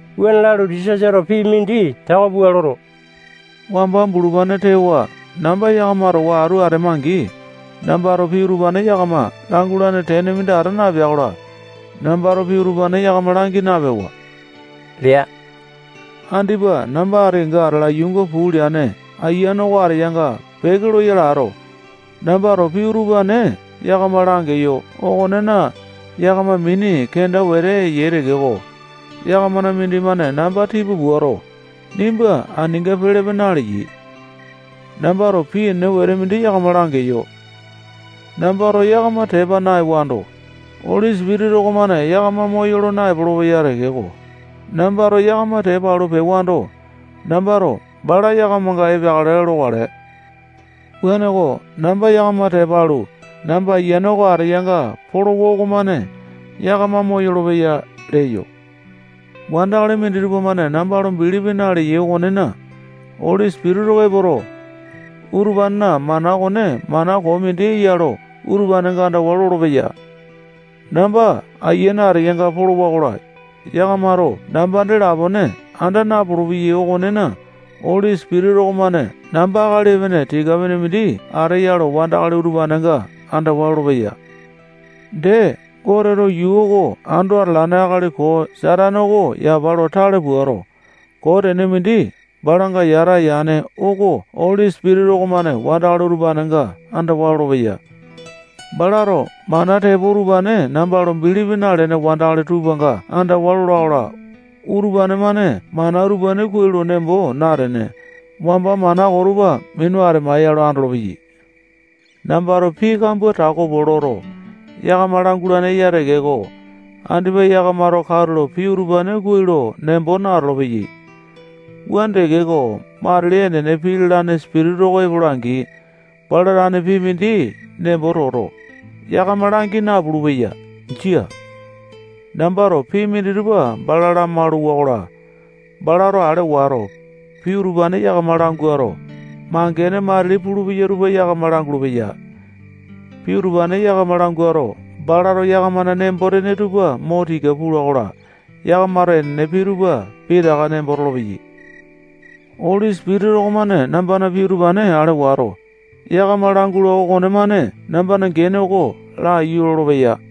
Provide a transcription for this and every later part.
Wuane lalu, Jisasato pii mindi tako pua loto, wamba bulupane tewa namba yakama towa atu atema-angi, nambato pii utupane yakama langulane tene mindi ata napea-kola, nambato pii utupane yakama langi napewa lea. Andipa namba ati kenga atala yuunga puu leane Ayiane oko ateyanga peke loyale ato, nambato pii utupane yakama langeyo okonena, yakama mini kenda wete eyai tekeko, yakamana mindimane namba tipa puato, nimba aninga pelepe naleyai. Nambato pii enene wete mindi yakama langeyo. Nambato yakama tepa naewando, Oli Sipitisa okomane yakama moyolo naepolo-peya tekeko, nambato yakama tepa alu pewando, nambato bala yakamanga epeakale lokale. Wuaneko, namba yakama tepa alu, namba Ayiane oko ateyanga polowa okomane yakama moyolo-peya leyo. Wandakali minditupa-mane namba lo bilipi naleyai okonena, Oli Sipitisa oko epoto, utupanena mana okone mana koo mindi eya lo utupanenga andawa lolopeya. Namba Ayiane ateyanga polowa-kola, yakamato namba dee lapone anda napulu-peyai okonena, Oli Sipitisa okomane namba akali epene tika-pene mindi ateya lo wandakali utupanenga andawa lolopeya. Dee, Goteto yuu oko ando atalane akali koo Satane oko yapa lo tale puato, koo tene mindi balanga yata yane oko Oli Sipitisa okomane wandakali utupanenga andawa lolopeya. Balato mana tepo utupane namba lo bilipi nalene wandakali tupanga andawa lola-kola, utupane-mane mana utupane kuai lo nembo natene, wamba mana koo tupa minu atemaeya lo andolopeyai. Nambato pii kambua tako pua loto, yakama langualane eya tekeko, andipa yakamato katulo pii utupane kuai lo nembo natolo-peyai. Wuane tekeko, matili enene pii lalane Sipitisa oko epola-angi, bala tane pii mindi nembo toto, yakama langi napulu-peya. Jia. Nambato pii minditupa bala lamalu-wakola, balato ale wato, pii utupane yakama languato, mangene matili pulupeya tupa yakama langulu-peya. Pii utupane yakama languato, balato yakamana nembo-tene tupa mo tika pula-kola, yakamato enene pii tupa pitaka nembo tolopeyai. Oli Sipitisa okomane nambana pii utupane ale wato, yakama langula okonemane nambana gene oko laiyu lolopeya.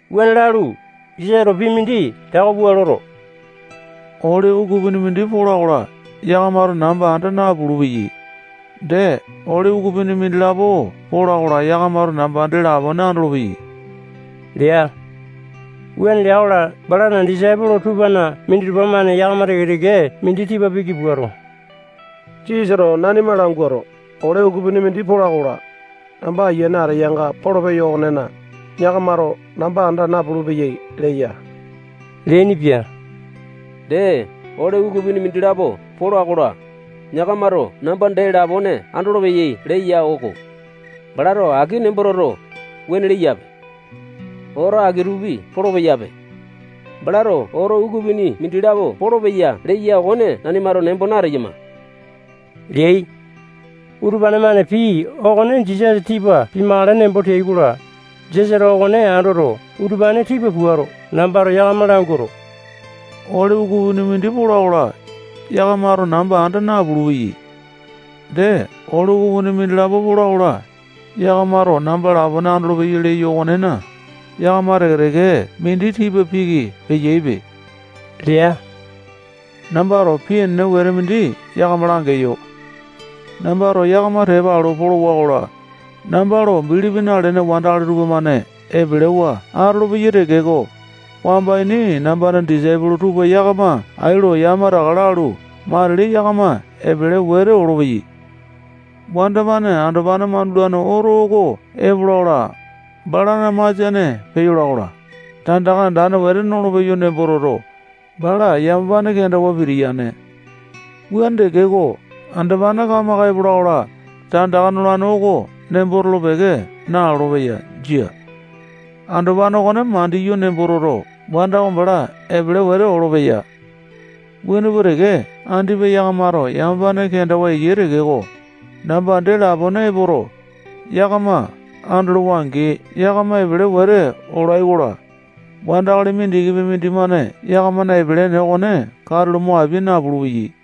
Wuane lalu, Jisasato pii mindi tako pua loto, ole ukupini mindi pola-kola, yakamato namba anda napulu-peyai. Dee, ole ukupini mindilapo pola-kola, yakamato namba dee lapone andolopeyai lea. Wuane lea-kola, balana disaipolo tupana minditupa-mane yakama teke-teke mindi tipa piki puato, Jisasato nanima languato, ole ukupini mindi pola-kola, namba Ayiane ateyanga polopeyo okonena, yakamato namba anda napulu-peyai leya. Dee, ole ukupini mindilapo pola-kola, yakamato namba dee lapone andolopeyai leya-oko. Balato aki nembo toto, wuane leyape. Oto aki-tupi polopeyape. Balato oto ukupini mindilapo polopeya leya okone nanimato nembo nateyama leai. Utupane-mane pii okone Jisasa tipa pimakale nembo teai-kola, Jisasato okone andoto, utupane tipa puato, nambato yakama languato, ole ukupini mindi pola-kola, yakamato namba anda napulu-peyai. Dee, ole ukupini mindilapo pola-kola, yakamato namba lapone andolopeyai leyo okonena, yakama teke-teke mindi tipa piki peyaipe lea. Nambato pii enene wete mindi yakama langeyo. Nambato yakama tepa alu polowa-kola, namba lo bilipi nalene wandakali tupamane epelewa atolopeyai tekeko, wamba ini nambana disaipolo tupa yakama ai lo yamataka lalu, matili yakama epele wete olopeyai. Wanda-mane andopane mandulane oto oko epola-kola, balana masiane peyola-kola, tandaka andane wete nolopeyo nembo toto, bala yamapane kendawa pitiyaini. Wuane tekeko, andopane kamaka epola-kola, tandaka nolane oko nembo tolo-peke nalolo-peya. Jia. Andopane okone mandiyo nembo toto, wanda oko bala epele wete olopeya. Wuane pua teke, andipa yakamato yamapane kenda eyai tekeko, namba dee lapone epoto, yakama andolowa-angi, yakama epele wete olai-kola, wandakali mindikipi mindimane yakamana epele ene okone katulo mo apia napulu-peya.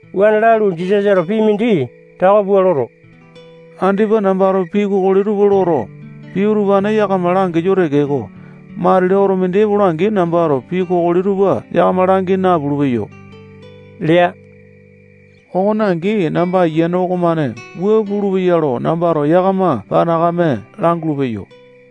Wuane lalu, Jisasato pii mindi tako pua loto, andipa nambato pii kokoli tupa loto, pii utupane yakama langeyo tekeko, matili oto mindi epola-angi, nambato pii kokoli tupa yakama langi napulu-peyo lea. Okone angi, namba Ayiane okomane wua pulupeya lo nambato yakama panakame langulu-peyo.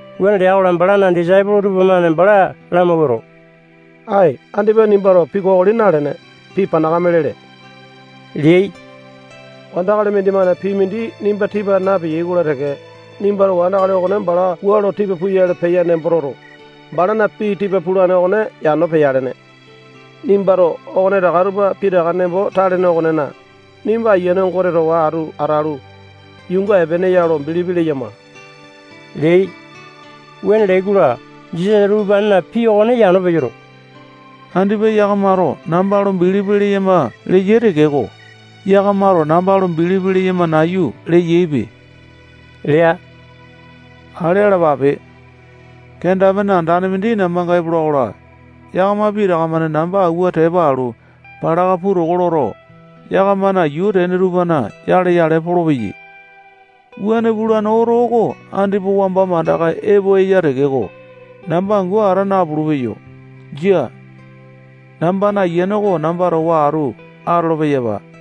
Wuane lea-kola, balana disaipolo tupamane bala lamawuato, ae, andipa nimbato pii kokoli nalene, pii panakame lele leai. Wandakali mindimane pii mindi nimba tipa napeya-kola teke, nimbato wandakali okone bala wua lo tipa puyale peya nembo toto, balana pii tipa pulane okone yano peyalene. Nimbato okonetaka tupa pitaka nembo talene okonena, nimba Ayiane Gote towa atu atalu, yuunga epeene ya lo bilipi leyama leai. Wuane leai-kola, Jisasato utupanena pii okone yano peyoto, andipa yakamato namba lo bilipi leyama leyai tekeko, yakamato namba lo bilipi leyama nayu leyaipe lea. Ale alapape. Kenda-pene andane mindi nambanga epola-kola, yakama pitaka-mane namba awua tepa alu, palaka puu toko loto, yakamana yuu tene tupana yale-yale polopeyai. Wuane pulane oto oko andipa wamba mandaka epo eya tekeko, namba angu ata napulu-peyo. Jia. Nambana Ayiane oko namba towa atu atolo-peyapa.